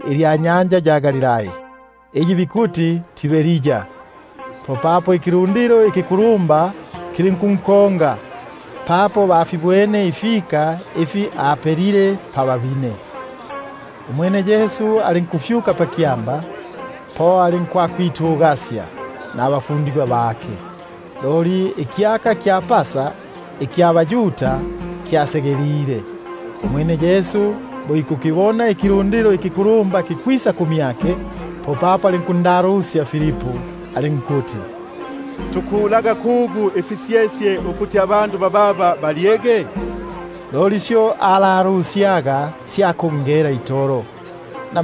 ilya nyanja ya Galilai, iyi bikuti yo Tiberia. Popapo ikilundilo ikikulumba kilinkunkonga, papo bafibwene ifika ifi apelile pababine. Umwene Yesu alinkufyuka pakyamba, po alinkwakwitugasya nabafundigwa bake. Loli ikyaka kya baYuda ikya Pasa kyasegelile. Umwene Yesu bo ikukibona ikilundilo ikikulumba kikwisa kumyake, popapo alinkundalusya Filipu alinkuti: Tukulaga kugu ifisyesye ukuti abandu bababa balyege? Loli syo ayobaga sya kungela itolo, na-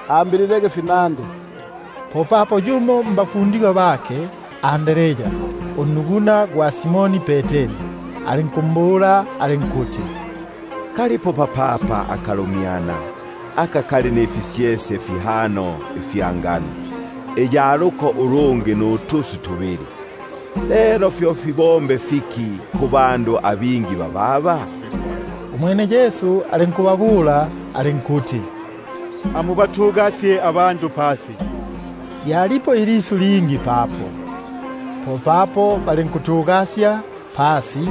ambililege finandi. Popapo yumo mbafundigwa bake, Andrea ugwamyabo gwa Simoni Peteri, alinkumbula alinkuti: Kalipo papapa akalumyana, aka kali nifisyesye fihano ifya malesi nutuswi tubili; fyo fibombe fiki kubandu abingi bababa? Umwene Yesu alinkuyoba alinkuti: Amubatugasye abandu pasi; lyalipo ilisu ilingi papo; popapo balinkutugasya pasi,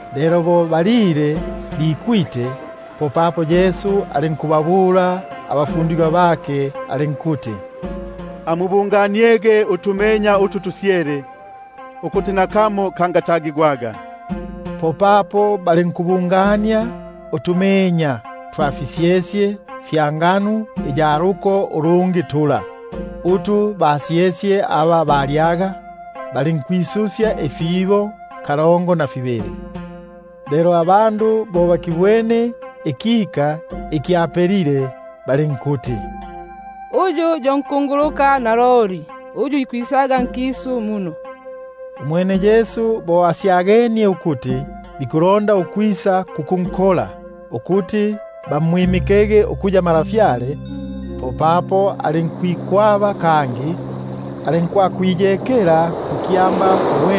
Lelo bo bikwite, alinkubabula abafundigwa bake alinkuti: Amubunganiege utumenya utu tusyele, ukuti nakamo kangata- gigwaga. Popapo balinkubungania utumenya twa fisyesye fya malesi fila, utu basyesye aba balyaga, balinkwisusya ifibo kalongo na fibili. Lelo bo abandu bakibwene ikika iki apelile, balinkuti: Uyu yo nkunguluka naloli yuyo ikwisaga nkisu. Umwene Yesu bo asyagenie ukuti bikulonda ukwisa kukunkola, ukuti bamwimike ukuya ntwa, popapo alinkwikwaba, alinkwakwiyekela kukyamba.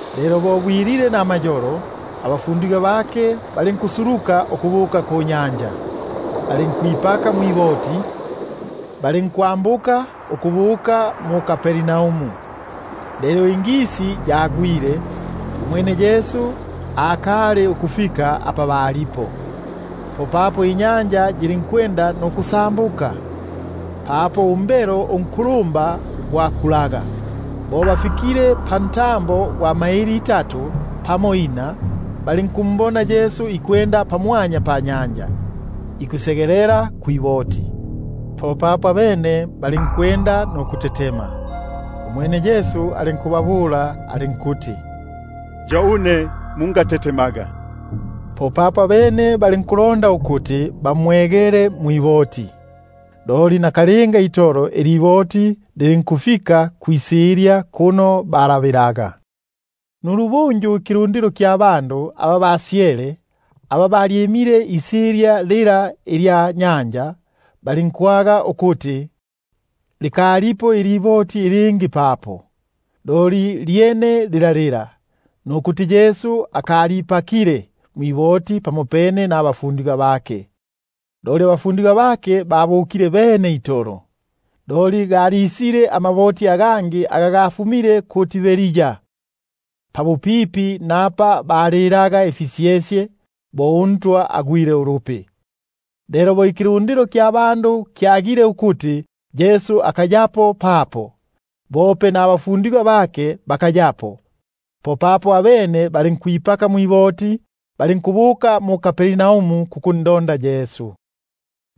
Lelo bo bwilile namayolo, abafundigwa bake balinkusuluka ukubuka kunyanja. Balinkwipaka mwiboti, balinkwambuka ukubuka mu-Kapernaumu. Lelo ingisi yagwile, umwene Yesu akali ukufika apa balipo. Popapo inyanja yilinkusa- mbuka, papo umbelo unkulumba gwakulaga. Bo bafigile pantambo gwa pamaili itatu pamo ina, balinkumbona Yesu ikwenda pamwanya panyanja, ikusegelela kwiboti; abene balinkutetema. Umwene alinkubabula alinkuti: Yo une, mungatetemaga. Abene balondaga ukumwegela mwiboti, loli nakalinga itolo iliboti lilinkufika kwisilya kuno balabilaga. Nulubunju ikilundilo iki kyalyimile isilya lila ilya nyanja, kilinkwaga ukuti likalipo iliboti ilingi papo, loli lyene lila lila; nukuti Yesu akalipakile mwiboti pamopene nabafundigwa bake, loli abafundigwa bake babukile bene itolo. Loli galisile amaboti aga gafumile mu-Tiberia, pabupipi napa balilaga ifisyesye, bo uNtwa agwile ulupi. Lelo bo ikilundilo kyagile ukuti Yesu akayapo papo, bope nabafundigwa bake bakayapo, popapo abene balinkwipaka mma- boti, balinkubuka mu-Kapernaumu kukundonda Yesu.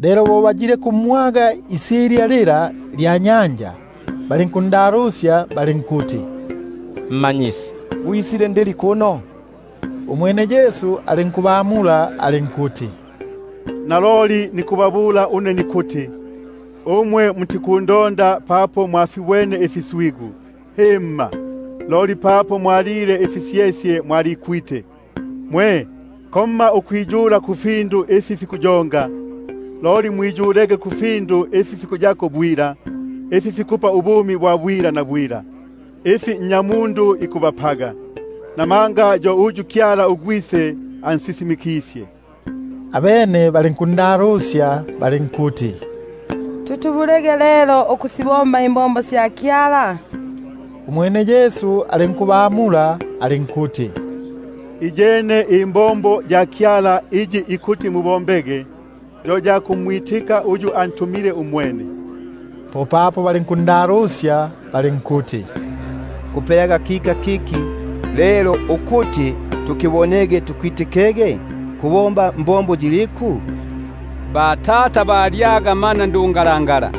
Lelo bo bayilekumwaga isilya lila lya nyanja, popapo balinkunda- lusya balinkuti: Rabi,#Rabi, ko kuti Mmanyisi. gwisile ndili kuno? Umwene Yesu alinkubamula alinkuti: Naloliloli nikubabula une nikuti, umwe mutikundonda papo mwafibwene ifika, loli papo mwa- lile ifisyesye, mwalikwite. Mungiyulaga kufindu ifi fikuyonga, loli mwiyulege kufindu ifi fikuyako bwila, ifi fikupa ubumi bwa bwila, ifi Nnyamundu ikubapaga; namanga yo uyu Kyala uGwise ansisimikisye. Abene balinkundalusya balinkuti: Tutubulege lelo ukusibomba imbombo sya Kyala? Umwene Yesu alinkubabula alinkuti: Iyi yo mbombo ya Kyala, ukuti mumwitikege yuyo alintumile. Popapo balinkundalusya balinkuti: Kubombaga kika kiliku lelo ukuti tukibone tukwitikege? Kubomba fiki? Batata balyaga mana ndungalangala,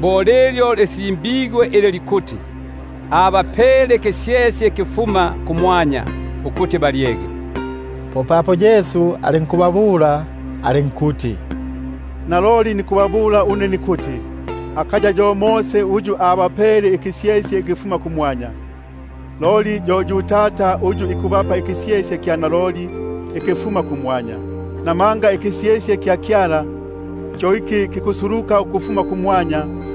bo lilyo lisimbigwe ili likuti: Abapele ikisyesye ikifuma kumwanya, ukuti balyege. Popapo Yesu alinkubabula alinkuti: Naloliloli nikubabula une nikuti: Akaya yo Mose uyu abapele ikisyesye ikifuma kumwanya, loli Tata yo ikubapa ikisyesye ikya naloli ikifuma kumwanya. Namanga ikisyesye kya Kyala, kyo iki kikusuluka ukufuma kumwanya,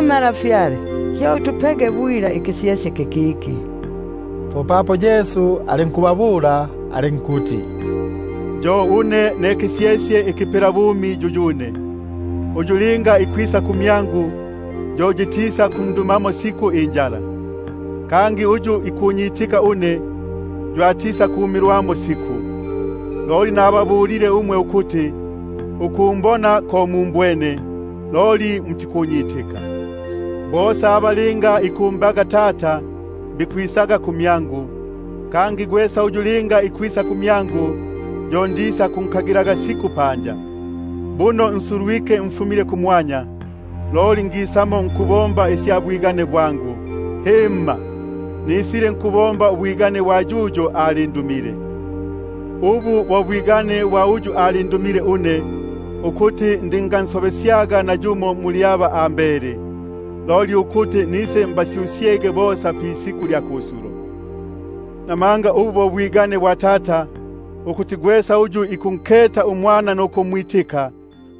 Malafyale, utupege bwila ikisyesye kikiki. Popapo Yesu alinkubabula alinkuti: Yo une ne kisyesye ikipelabumi; uyu linga ikwisa kumyangu, yo yitisakundumaga injala; kangi uyu ikunyitika une, yo atisakumilwamo siku. Loli nababulile umwe ukuti, ukumbona ko mumbwene, loli mutikunyitika. Kosa aka Tata ikumbaga, kisakwisaga kumyangu; kangi gwesa uyu linga ikwisa kumyangu, yo ndisakunkagilaga siku panja. Buno ngasuluka ukufuma kumwanya nkubomba ubwigane bwangu, loli nkubomba ubwigane bwa yuyo alindu- mile. Ubu bo bwigane bwa uyu alindumile une, ukuti nangakatagaga nakamo muli utu ambele, loli ukuti nisenka- syusyesge pisiku lya kusulo. Namanga ubu bo bwigane bwa Tata, ukuti gwesa uyu ikunketa uMwana nukumwitika,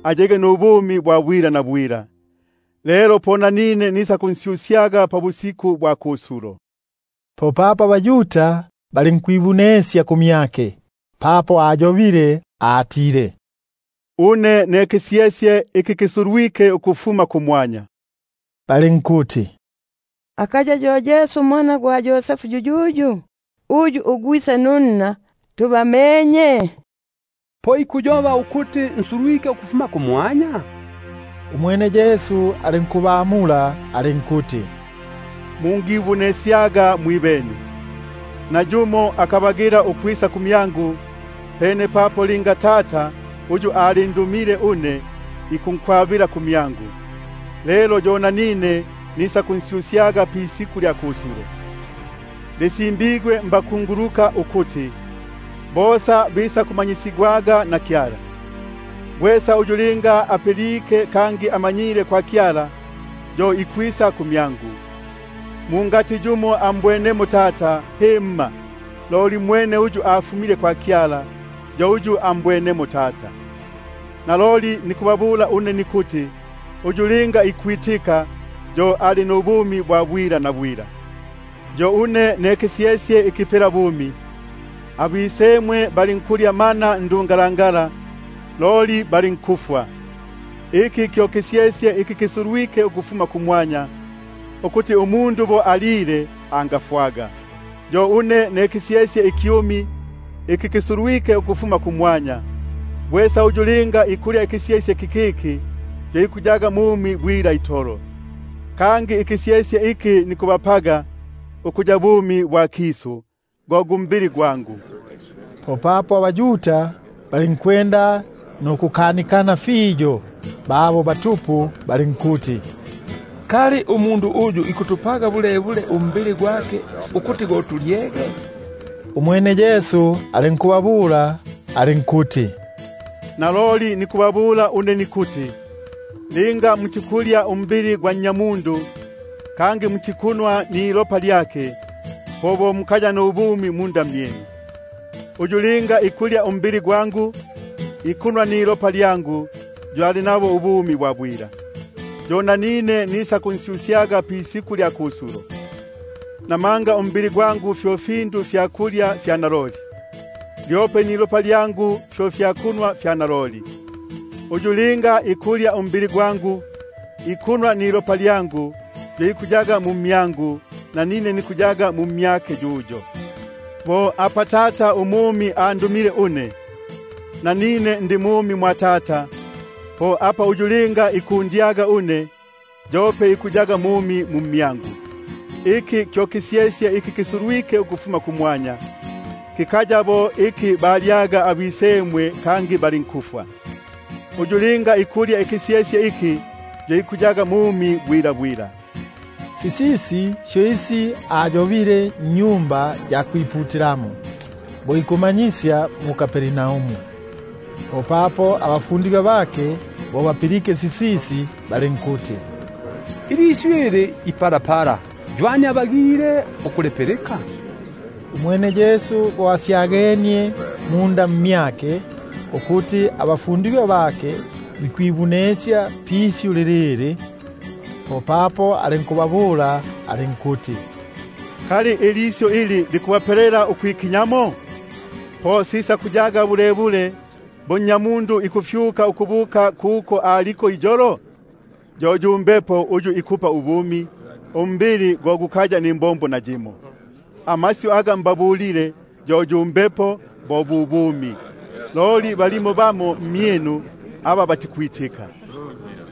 ayege nubumi bwa bwila; nanine nisakunsyusyaga pisiku lya kusulo. Popapo abaYuda balinkwibunesya kumyake, papo atile: Une ne kisyesye iki kisulwike ukufuma kumwanya; balinkuti: Akaya yo Yesu unnya Yosefu yuyuyu? Uyu ugwise nunna tubamenye? Po ikuyoba bulebule ukuti nsulwike ukufuma kumwanya? Umwene Yesu alinkubamula alinkuti: Mungi- bunesyaga mwibene. Nayumo akabagila ukwisa kumyangu, loli pene apa linga Tata, uyu alindumile une ikunkwaba; kangi nanine nisakunsyusyaga pisiku lya kusulo. Lisimbigwe mbakunguluka ukuti: Bosa bisakumanyisigwaga na Kyala. Gwesa uyu linga apilike kangi amanyile kwa Kyala, yo ikwisa ku- myangu. Mungatigi yumo ambwenemo Tata, loli mwene uyu afumile kwa Kyala, yo ambwenemo Tata. Naloliloli nikubabula une nikuti, uyu linga ikwitika, yo ali nubumi bwa bwila. Yo une ne kisyesye ikipelabumi. Abisemwe balinkulya mana ndungalangala, loli balinkufwa. Iki kyo kisyesye iki kisulwike ukufuma kumwanya, ukuti umundu bo alile, anga- fwaga. Yo une ne kisyesye ikyumi, iki kisulwike ukufuma kumwanya; gwesa uyu linga ikulya ikisyesye kikiki, yo ikuyaga mumi bwila itolo. Kangi ikisyesye iki nikubapaga ukuya bumi bwa kisu, go gu mbili gwangu. Popapo abaYuda balinkukanikana fiyo babo batupu balinkuti: Kali umundu uyu ikutupaga bulebule umbili gwake ukuti tulyege? Umwene Yesu alinkubabula alinkuti: Naloliloli nikubabula une nikuti, linga mutikulya umbili gwa Nnyamundu, mutikunwa nilopa lyake, po mukaya nubumi munda mmyinu. Uyu linga ikulya umbili gwangu, ikunwa nilopa lyangu, yo ali nabo ubumi bwa bwila; yo nanine nisa- kunsyusyaga pisiku lya kusulo. Namanga umbili gwangu fyo fyakulya fya naloli, lyope nilopa lyangu fyo fyakunwa fya naloli. Uyu linga ikulya umbili gwangu, ikunwa nilopa lyangu, yo ikuyaga mmyangu, nanine mmyake. Bo apa Tata umumi andumile une, nanine ndi mumi mwa Tata, po apa uyu ikundya une, yope ikuyaga mumi mu mmyangu. Iki kyo kisyesye iki kisulwike ukufuma kumwanya, kikaya bo iki balyaga abisemwe kangi balinkufwa; uyu linga ikulya ikisyesye iki, yo ikuyaga mumi bwila bwila. Sisisi syo isi asiyobile mu-Sinagogi, bo ikumanyisya mu-Kapernaumu. Popapo bingi mbafundigwa bake, bo bapilike sisisi, bali- nkuti: Ilisyu ili ipalapala, ywani abagile ukulipilika? Umwene Yesu bo asyagenie munda mmyake, ukuti abafundigwa bake bikwibunesya pisyu lilili, popapo alinkubabula alinkuti: Kali ilisyu ili likubapelela ukwikinya? Po sisakuyaga bulebule bo Nnyamundu ikufyuka ukubuka kuko aliko iyolo? Yo yu Mbepo uyu ikupa ubumi, umbili go gukaya nimbombo nayimo; amasyu aga mbabulile, yo yu mbepo, bo bu bumi. Loli balimo bamo mmyinu aba batikwitika;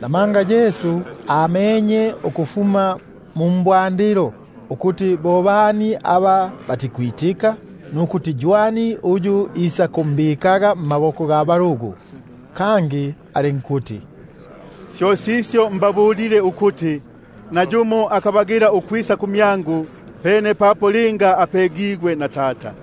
namanga Yesu amenye ukufuma kubwandilo ukuti bo bani aba batikwitika, nukuti ywani uyu isakumbikaga mmaboko ga balugu. Kangi alinkuti: Syo sisyo mbabulile ukuti, nayumo akabagila ukwisa kumyangu, pene papo linga apegigwe na Tata.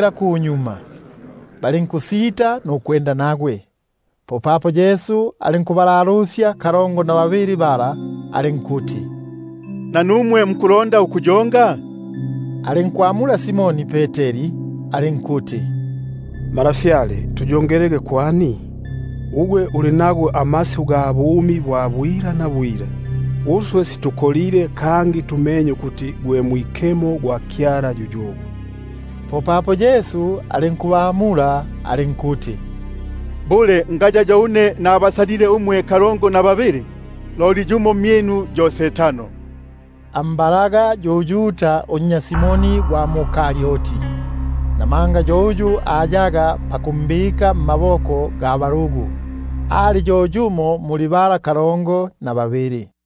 kunyuma, balinkusita nukwenda nagwe. Popapo Yesu alinkubabula kalongo na babili bala alinkuti: Nanumwe mukulonda ukuyonga? Alinkwamula Simoni Peteri alinkuti: Malafyale, tuyongelege kwani? Ugwe uli nago amasyu ga bumi bwa bwila bwila; uswe situkolile, kangi tumenye ukuti gwe Mwikemo gwa Kyala yuyugwe. Popapo Yesu alinkubamula alinkuti: Bule ngabasalile umwe kalongo na babili? Loli yumo mmyinu yo mohesi. Ambalaga yu Yuda unnya Simoni gwa mu-Karioti; namanga ayaga pakumbika mmaboko ga balugu, ali yo yumo muli bala kalongo na babili.